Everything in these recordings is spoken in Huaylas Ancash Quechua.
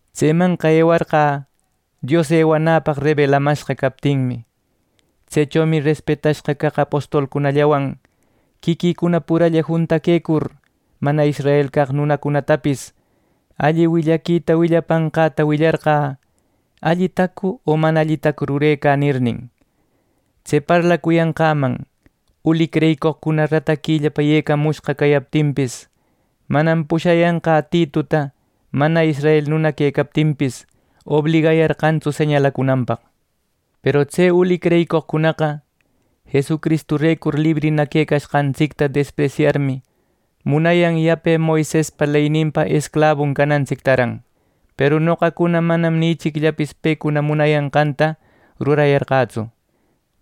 Tsemanqa ewarqä Dios ewanäpaq rebelamashqa captinmi. Tsechomi respetashqa caq apostolcunallawan quiquïcuna puralla juntaquecur, mana israel caq nunacunatapis alli willaquita willapanqäta willarqä “¿Allitacu o mana allitacu rurecä?” nirnin. Tse parlacuyanqäman uli creyicoqcuna rataquillapa yecayämushqa cayaptinpis, manam pushayanqä Tituta mana israel nuna quecaptinpis, obligayarqantsu señalacunanpaq. Peru tse uli creyicoqcunaqa Jesucristurecur librina quecashqantsicta despresyarmi, munayan yape Moisespa leyninpa esclabuno canantsictaran. Peru noqacuna manam ni ichicllapis pecuna munayanqanta rurayarqätsu,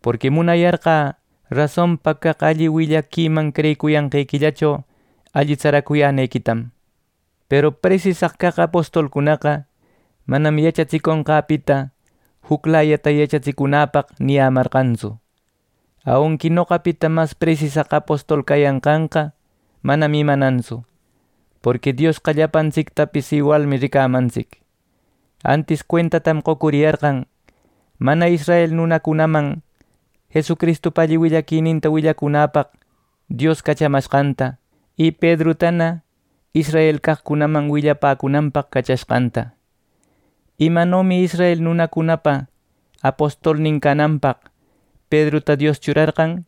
porqui munayarqä rasonpa caq alli willaquiman creyicuyanqequillacho alli tsaracuyänequitam. Peru presisaq caq apostolcunaqa manam yachatsiconqäpita juclayata yachatsicunäpaq niyämarqantsu. (Aunqui noqapita mas presisaq apostol cayanqanqa manam imanantsu, porqui Diosqa llapantsictapis iwalmi ricamantsic.) Antis cuentatam qocuriyarqan, mana israel nunacunaman Jesucristupa alli willaquininta willacunäpaq Dios cachamashqanta, y Pedrutana Israel caqcunaman willapäcunanpaq cachashqanta. Imanomi israel nunacunapa apostolnin cananpaq Pedruta Dios churarqan,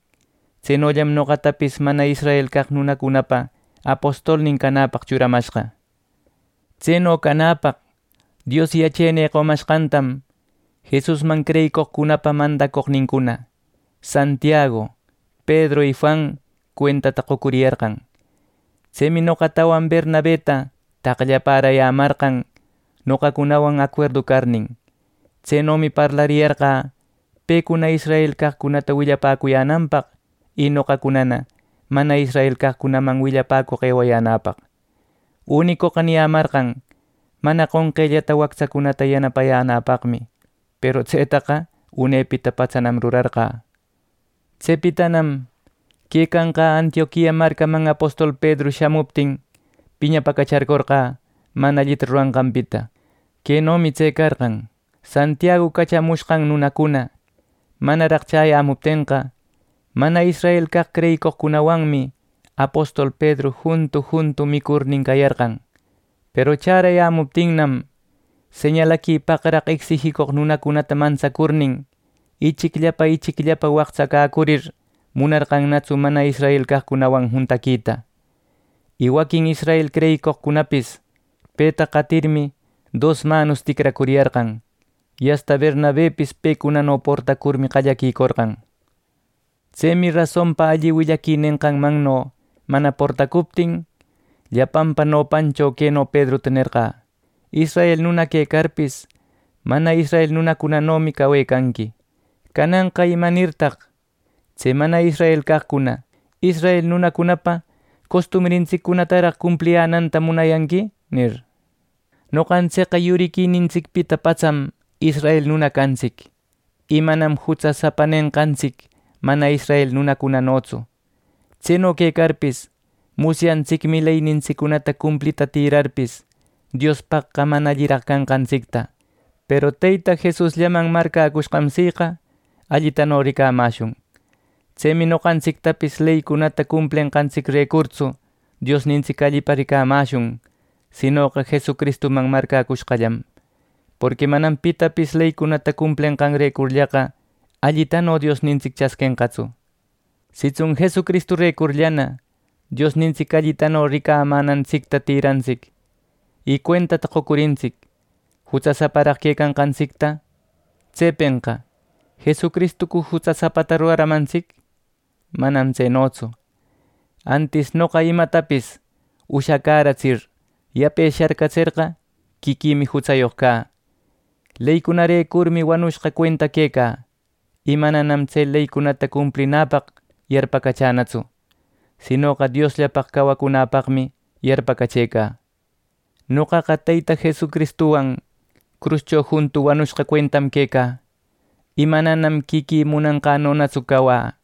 tsenollam noqatapis mana israel caq nunacunapa apostolnin canäpaq churamashqa. Tseno canäpaq Dios yachenï qomashqantam Jesusman creyicoqcunapa mandacoqnincuna Santiagu, Pedru y Juan, cuentata qocuriyarqan. Tsemi noqatawan Bernabeta taqllaparayämarqan noqacunawan acuerdu carnin. Tsenomi parlariyarqä pecuna Israel caqcunata willapäcuyänanpaq y noqacunana mana israel caqcunaman willapäcoq eucuyänäpaq. Unicoqa niyämarqan mana qonqellata wactsacunata yanapayänäpaqmi. Peru tsetaqa unepita patsanam rurarqä. Tsepitanam quecanqä Antioquia marcaman apostol Pedru shamuptin, piñapäcacharcorqä mana allita ruranqanpita. Quenomi tse carqan: Santiagu cachamushqan nunacuna manaraq chäyämuptenqa, mana israel caq creyicoqcunawanmi apostol Pedru juntu juntu micurnin cayarqan. Peru chärayämuptinnam, señalaquipaqraq ecsijicoq nunacunata mantsacurnin, ichicllapa ichicllapa waqtsacäcurir munarqannatsu mana israel caqcunawan juntaquita. Y waquin israel creyicoqcunapis peta qatirmi dosmanos ticracuriyarqan. Y asta Bernabepis pecunano portacurmi qallaquicorqan. Tsemi rasonpa alli willaqui nenqanmanno mana portacuptin, llapanpa nopancho queno Pedruta nerqä: “Israel nuna quecarpis, mana israel nunacunanomi cawecanqui. Cananqa ¿Imanirtaq tse mana israel caqcuna israel nunacunapa costumbrintsiccunataraq cumpliyänanta munanqui!” nir. Noqantsicqa yuriquinintsicpita patsam israel nuna cantsic, y manam “Jutsasapa” nenqantsic, mana israel nunacunanotsu. Tseno quecarpis, musyantsicmi leynintsiccunata cumplita tïrarpis, Diospaqqa mana alliraq canqantsicta, peru Teyta Jesusllaman marcäcushqam siqa allitano ricamäshun. Tsemi noqantsictapis leycunata cumplenqantsicrecurtsu Diosnintsic allipa ricamäshun, sinoqa Jesucristuman marcäcushqallam. Porqui manam pitapis leycunata cumplenqanrecurllaqa allitano Diosnintsic chasquenqatsu. Sitsun Jesucristurecurllana Diosnintsic allitano ricamänantsicta tïrantsic, y cuentata qocurintsic jutsasaparaq quecanqantsicta. Tsepenqa ¿Jesucristucu jutsasapata ruraramantsic? ¡Manam tsenotsu! Antis noqa imatapis ushacäratsir yape sharcatserqa, quiquïmi jutsayoq cä. Leycunarecurmi wanushqa cuenta quecä, y mananam tse leycunata cumplinäpaq yarpacachänatsu; sinoqa Diosllapaq cawacunäpaqmi yarpacachëcä. Noqaqa Teyta Jesucristuwan cruscho juntu wanushqa cuentam quecä, y manam quiquï munanqänonatsu cawä,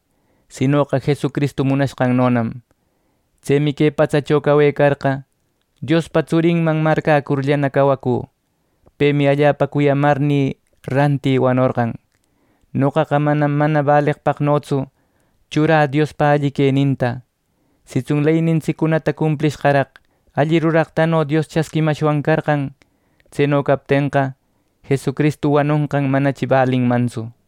sinoqa Jesucristu munanqannonam. Tsemi que patsacho cawecarqa, Diospa tsurinman marcäcurllana cawacü. Pemi allapa cuyamarnï rantï wanorqan. Noqaqa manam mana baleqpaqnotsu churä Diospa alli queninta. Sitsun leynintsiccunata cumplishqaraq alli ruraqtano Dios chasquimashwan carqan; tseno captenqa, Jesucristu wanonqan manachi balinmantsu.